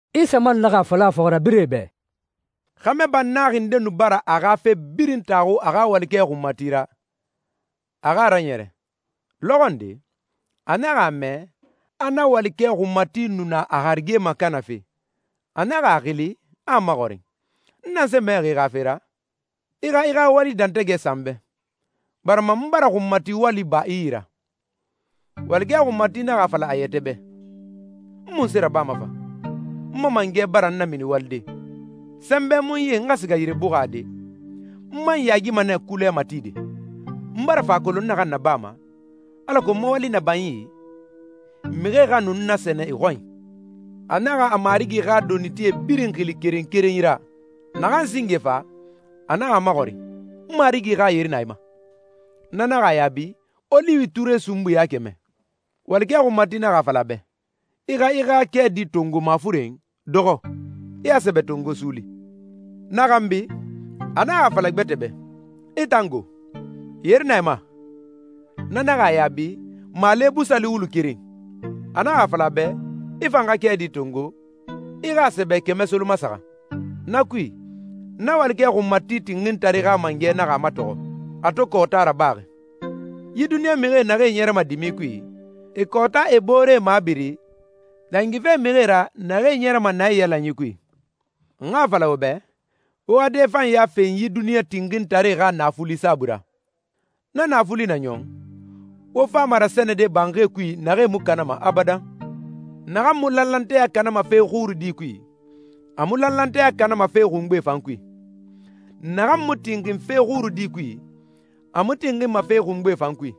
Isa man naxa a fala a fɔxirabirɛe bɛ, «Xɛmɛ bannaxi nde nu bara a xa fe birin taxu a xa walikɛ xunmati ra, a xa a raɲɛrɛ. Lɔxɔ nde, a naxa a mɛ, a na walikɛ xunmati nu na a harige makanafe. A naxa a xili, a a maxɔrin, ‹N nanse mɛxi i xa fe ra? I xa i xa wali dɛntɛgɛ sa n bɛ, barima n bara xunmati wali ba i yi ra.› Walikɛ xunmati naxa a fala a yɛtɛ bɛ, ‹N munse rabama fa? N ma mangɛ bara n namini walide. Sɛnbɛ mu n yi n xa siga yire buxade, n man yaagima nɛ kulɛ matide. N bara fa a kolon n naxan nabama, alako n ma wali na ba n yi, mixie xa nu n nasɛnɛ e xɔnyi.›» «A naxa a marigi xa donitie birin xili keren keren yi ra. Naxan singe fa, a naxa a maxɔrin, ‹N marigi xa yeri na i ma?› Na naxa a yaabi, ‹Oliwi ture sunbui ya kɛmɛ.› Walikɛ xunmati naxa a fala a bɛ, ‹I xa i xa kɛɛdi tongo mafuren, dɔxɔ, i a sɛbɛ tongo suuli.› Na xanbi, a naxa a fala gbɛtɛ bɛ, ‹I tan go? Yeri na i ma?› Na naxa a yaabi, ‹Maale busali wulu keren.› A naxa a fala a bɛ, ‹I fan xa kɛɛdi tongo, i xa a sɛbɛ kɛmɛ solomasaxan.› Na kui, na walikɛ xunmati tinxintare xa mangɛ naxa a matɔxɔ, a to kɔɔta rabaxi.» «Yi duniɲa mixi naxee ɲɛrɛma dimi kui, e kɔɔta e booree mabiri, dangife mixie ra naxee ɲɛrɛma naiyalanyi kui. N xa a fala wo bɛ, wo xa dɛfanɲa fen yi duniɲa tinxintare xa naafuli saabui ra. Na naafuli na ɲɔn, wo fama rasɛnɛde banxie kui naxee mu kanama abadan.» «Naxan mu lanlanteya kanama fe xurudi kui, a mu lanlanteya kanama fe xungbe fan kui. Naxan mu tinxin fe xurudi kui, a mu tinxinma fe xungbe fan kui.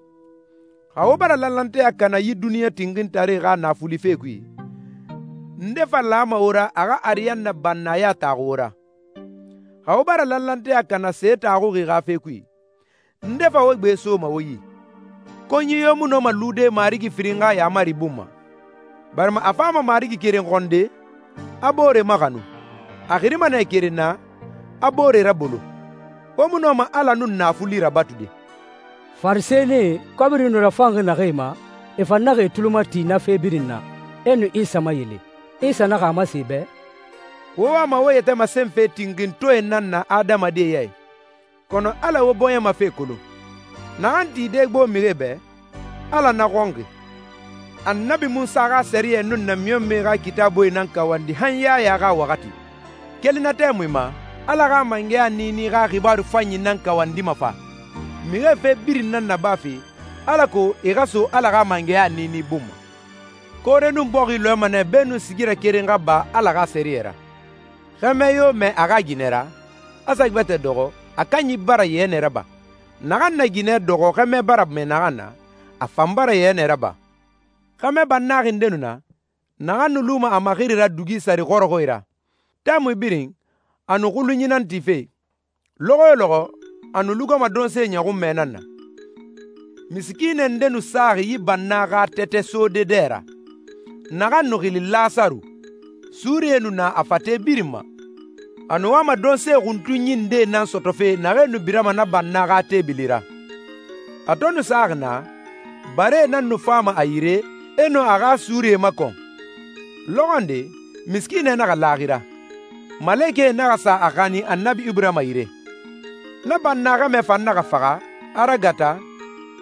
Xa wo bara lanlanteya kana yi duniɲa tinxintare xa naafuli fe kui, nde fa lama wo ra a xa ariyanna bannaya taxu wo ra? Xa wo bara lanlanteya kana se taxuxi xa fe kui, nde fa wo gbe soma wo yi?» «Konyi yo mu nɔma lude marigi firin xa yaamari bun ma, barima a fama marigi keren xɔnde, a boore maxanu. A xirima nɛ keren na, a boore rabolo. Wo mu nɔma Ala nun naafuli rabatude.» Farisɛnie, kɔbiri nu rafanxi naxee ma, e fan naxa e tuli mati na fe birin na, e nu Isa mayele. Isa naxa a masen e bɛ, «Wo wama wo yɛtɛ masenfe tinxintɔɛe nan na adamadie ya i, kɔnɔ Ala wo bɔɲɛ ma fe kolon. Naxan tide gbo mixie bɛ, Ala na xɔnxi.» «Annabi Munsa xa sɛriyɛ nun namiɲɔnmɛe xa Kitaabuie nan kawandi han Yaya xa waxati. Keli na tɛmui ma, Ala xa mangɛya niini xa xibaaru fanyi nan kawandima fa, mixie fe birin nan nabafe, alako e xa so Ala xa mangɛya niini bun ma. Koore nun bɔxi lɔɛma nɛ beenun sigirɛ keren xa ba Ala xa sɛriyɛ ra.» «Xɛmɛ yo mɛɛ a xa ginɛ ra, a sa gbɛtɛ dɔxɔ, a kanyi bara yɛnɛ raba. Naxan na ginɛ dɔxɔ xɛmɛ bara mɛɛ naxan na, a fan bara yɛnɛ raba.» «Xɛmɛ bannaxi nde nu na, naxan nu luma a maxiri ra dugi sare xɔrɔxɔɛe ra. Tɛmui birin, a nu xulunyi nan tife. Lɔxɔ yo lɔxɔ, a nu lugama donse ɲɔxunmɛ nan na. Misikiinɛ nde nu saxi yi banna xa tɛtɛ sode dɛ ra, naxan nu xili Lasaru. Suurie nu na a fate birin ma. A nu wama donse xuntunyi ndee nan sɔtɔfe naxee nu birama na banna xa teebili ra. A to nu saxi naa, baree nan nu fama a yire, e nu a xa suurie makɔn.» «Lɔxɔ nde misikiinɛ naxa laaxira, malekɛe naxa sa a xanin Annabi Iburahima yire. Na banna xɛmɛ fan naxa faxa, a ragata,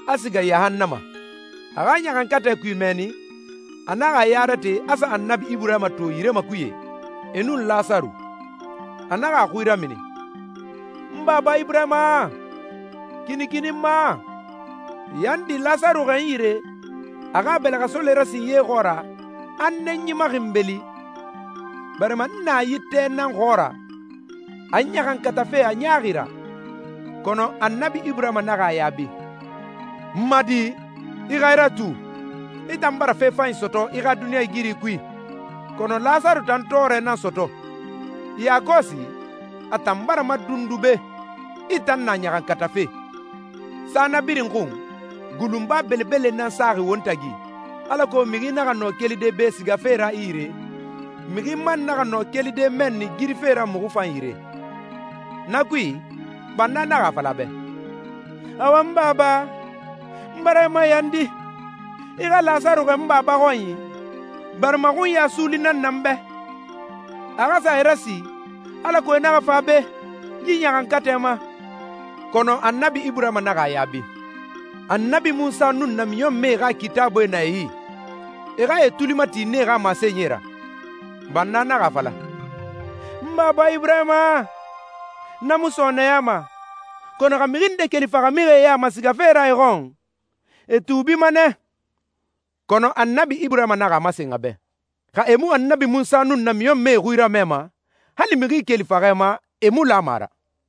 a siga yahannama. A xa ɲaxankatɛ kui mɛnni, a naxa a ya rate a sa Annabi Iburahima to yire makuye, e nun Lasaru. A naxa a xui ramini, ‹N baba Iburahima, kinikini n ma! Yandi, Lasaru xɛɛ n yire, a xa a bɛlɛxɛsole rasin ye xɔɔra, a n nɛnyi maxinbeli, barima n na yi tɛ naxan xɔɔra, a n ɲaxankatafe a ɲaaxi ra!›» «Kɔnɔ Annabi Iburahima naxa a yaabi, ‹N ma di, i xa i ratu, i tan bara fe fanyi sɔtɔ i xa duniɲɛigiri kui, kɔnɔ Lasaru tan tɔɔrɛ nan sɔtɔ. Yakɔsi, a tan bara madundu be, i tan na ɲaxankatafe. Sa na birin xun, gulunba belebele nan saxi won tagi, alako mixi naxa nɔ kelide be sigafe ra i yire, mixi man naxa nɔ kelide mɛnni girife ra muxu fan yire.›» «Na kui, banna naxa a fala a bɛ, ‹Awa n baba, n bara i mayandi, i xa Lasaru xɛɛ n baba xɔnyi, barima xunya suuli nan na n bɛ. A xa sa e rasi, alako e naxa fa be, yi ɲaxankatɛ ma.› Kɔnɔ Annabi Iburahima naxa a yaabi, ‹Annabi Munsa nun namiɲɔnmɛe xa Kitaabuie na e yi. E xa e tuli mati nee xa masenyie ra.› Banna naxa a fala, ‹N baba Iburahima, na mu sɔɔnɛyama, kɔnɔ xa mixi nde keli faxamixie ya ma sigafe ra e xɔn, e tuubima nɛ.› Kɔnɔ Annabi Iburahima naxa a masen a bɛ, ‹Xa e mu Annabi Munsa nun namiɲɔnmɛe xui ramɛma, hali mixi keli faxɛ ma, e mu lama a ra.›»